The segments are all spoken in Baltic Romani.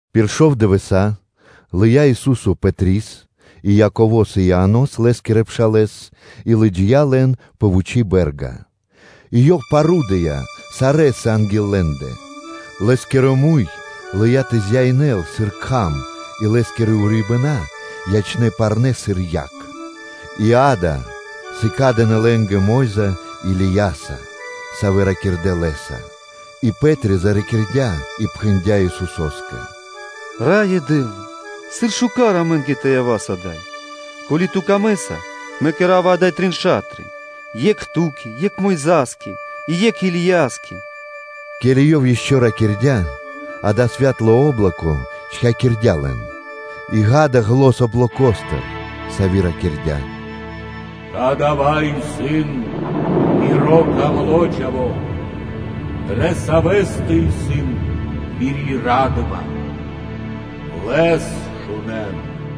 Пир шов дывэса́ лыя́ Ису́со Пэтрис и Яково́с и Ианос, лэ́скирэ пшалэ́с, и лыджия́ лэн тринджинэн пэ вучи́ бэ́рга. И Ёв парудыя сарэ́са анги́л лэ́ндэ. Лэ́скиро муй лыя́ тэ зяинэл, сыр кхам, и Лэ́скирэ урибэна́ ячнэ́ парнэ́ сыр дуд (свэ́то). И, акэ, сыкадынэ лэ́нгэ Мо́йза Илияса, савэ́ ракирдэ́ Лэ́са. И Пэ́три заракирдя и пхэндя́ Исусо́скэ: “Раё Дэ́вла! Сыр исын шука́р амэ́нгэ тэ явас ада́й. Ко́ли Ту камэ́са, мэ кэра́ва ада́й трин ша́тры: екх Ту́кэ, екх Мойза́скэ, и екх Илияскэ.” Ке́ли ёв ишчо (инкэ́) ракирдя́, акэ, святло о́блоко чхакирдя лэн, и, акэ, зан облокостыр, сави́ ракирдя́: “Кадава́ исын Миро Дро́го Чхаво́, дрэ Савэ́стэ исын Мири́ ра́дыма, Лэс шунэ́н.”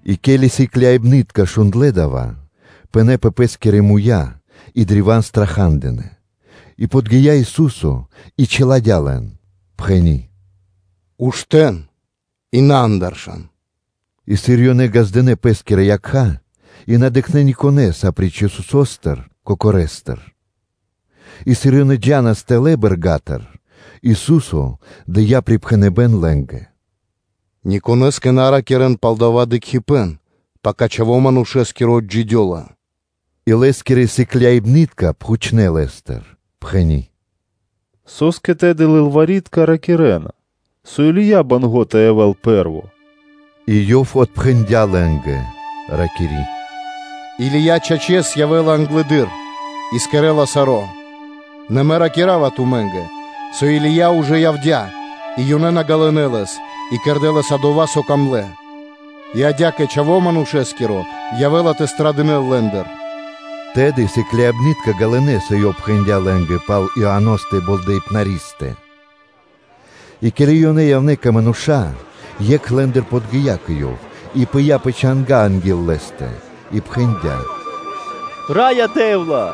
И ке́ли сыкляибны́тка шундлэ́ дава́, ёнэ пынэ́ пэ пэ́скирэ муя́ и древа́н страха́дынэ. И подги́я Ису́со и чиладя́ лэн, пхэни́: “Уштэ́н и на андыршан.” И сыр ёнэ ґаздынэ́ пэ́скирэ якха́, и на дыкхнэ́ никонэ́с, апри́ч Исусо́стэ Кокорэстэ. И сыр ёнэ джа́нас тэлэ́ бэрга́тыр, Ису́со дыя́ припхэныбэ́н лэ́нгэ: “Ни конэ́скэ на ракирэ́н пал дава́ дыкхибэ́н, пака Чхаво́ Манушэ́скиро отджидёла.” И Лэ́скирэ сыкляибны́тка пхучнэ́ Лэ́стыр, пхэни́: “Со́скэ тэды лылвари́тка ракирэ́на, со Или́я банго́ тэ явэ́л пэ́рво?” И Ёв отпхэндя́ лэ́нгэ, ракири́: “Или́я, чачэс, явэ́ла англэды́р и кэрэ́ла саро́. Нэ Мэ ракира́ва тумэ́нгэ, со Или́я ужэ явдя́, и ёнэ на ґалынэ́ лэс, и кэрдэ́ лэ́са дова́, со сыс пир ило́. И адя́кэ Чхаво́ Манушэ́скиро явэ́ла тэ страдынэл лэ́ндыр.” Тэды сыкляибны́тка ґалынэ́, со Ёв пхэндя́ лэ́нгэ пал Ианостэ Болдэипнаристэ. И ке́ли ёнэ явнэ́ кэ мануша́, екх лэ́ндыр подги́я кэ Ёв, и пыя́ пэ чанга́ анги́л Лэ́стэ, и пхэндя́: “Раё Дэ́вла!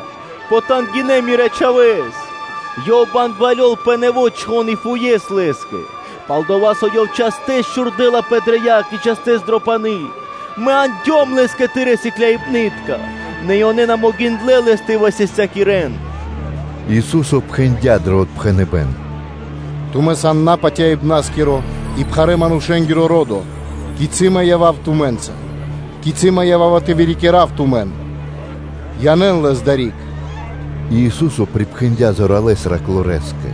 Потангинэ мирэ́ чхавэ́с, ёв бэнгвалёл пэ нэво́ чхон, и фуес лэ́скэ; пал-дова́ со ёв частэс чхурдэлапэ дрэ яг и частэс дро пани́. И мэ яндём лэс кэ Тырэ́ сыкляибны́тка, нэ ёнэ на могиндлэ́ лэс тэ высастякирэн.” Ису́со пхэндя́ дро отпхэныбэ́н: “Тумэ́ сан напатяибнаскиро и пхарэ́-манушэ́нгиро ро́до, кицы́ Мэ тэ явав тумэ́нца? Кицы́ Мэ ява́ва тэ вырикирав тумэн? Янэ́н лэс адари́к.” И Ису́со припхэндя́ зоралэ́с раклорэскэ,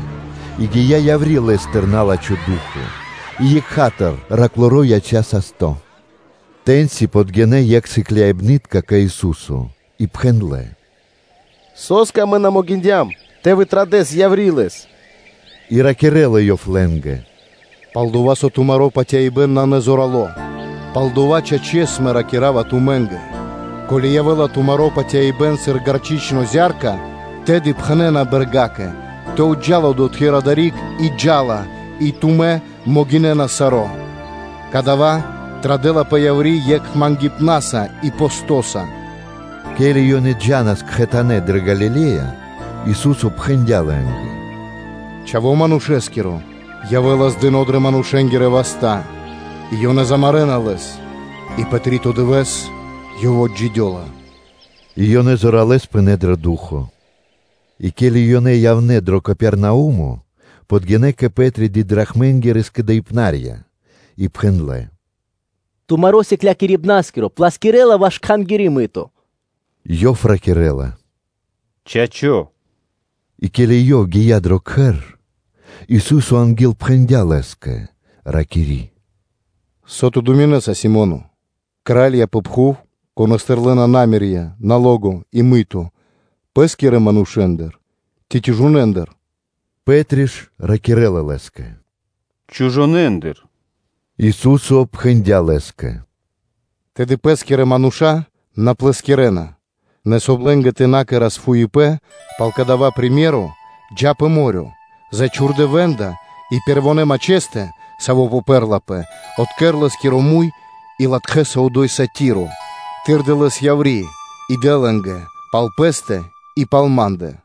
и гия́ яври́ лэ́стыр на́лачхо ду́хо (фа́но), и екха́тыр тэрнэ́-бэршэнгиро яця́ састо́. Тэ́ньци подгинэ́ екх сыкляибны́тка кэ Ису́со и пхэндлэ́: “Со́скэ амэ на могиндям тэ традас яври́ лэс?” И ракирэ́ла Ёв лэ́нгэ: “Пал-дова́ со тумаро́ патяибэ́н исын назорало; палдова́, чачэс, Мэ ракира́ва тумэ́нгэ: ко́ли явэ́ла тумаро́ патяибэ́н сыр гарчычно зя́рка, тэды пхэнэ́на бэргакэ ‘тэ джал одотхы́р адари́к ‘и джа́ла; и тумэ́ могинэ́нас саро́. Кадава́ традэлапэ яври́ екхэ мангипнаса и постоса.” Ке́ли ёнэ джа́нас кхэтанэ́ дрэ Галиле́я, Ису́со пхэндя́ лэ́нгэ: “Чхаво́ Манушэ́скиро явэ́ла здыно дрэ манушэ́нгирэ васта́; и ёнэ замарэна Лэс; и пэ три́то дывэ́с Ёв отджидёла.” И ёнэ ячнэ́ древа́н смэнтна (скучна). И ке́ли ёнэ явнэ́ дро Капернаумо, подгинэ́ кэ Пэ́три скэдыибнарья пэ дидрахмы и пхэндлэ́: “Тумаро Сыклякирибна́скиро плэскирэла ваш Кхангири́ мыто?” Ёв ракирэ́ла: “Чачо́.” И ке́ли ёв гия́ дро кхэр, Ису́со анги́л пхэндя́ лэ́скэ, ракири́: “Со ту думинэса, Симоне? Кра́лья пэ пхув, конэ́стыр лэ́на мыто (такса): пэ́скирэ манушэ́ндыр ци чужонэндыр?” Пэ́три ж ракирэ́ла Лэ́скэ: “Чужонэндыр.” Ису́со пхэндя́ лэ́скэ: “Тэды пэ́скирэ мануша́ на плэскирэна. Нэ, соб (кай) лэ́нгэ тэ на кэра́с фуипэ́н пал кадава́ приме́ро (сыкаибэ́н), джа́ пэ мо́рё (дэрья́в), зачхурдэ вэндка, и пэрвонэ́ мачхэстэ, саво́ попэрлапэ, откэр лэ́скиро муй и латхэса одо́й статиро; тырдэ лэс яври́ и дэ лэ́нгэ пал пэ́стэ и пал Ма́ндэ.”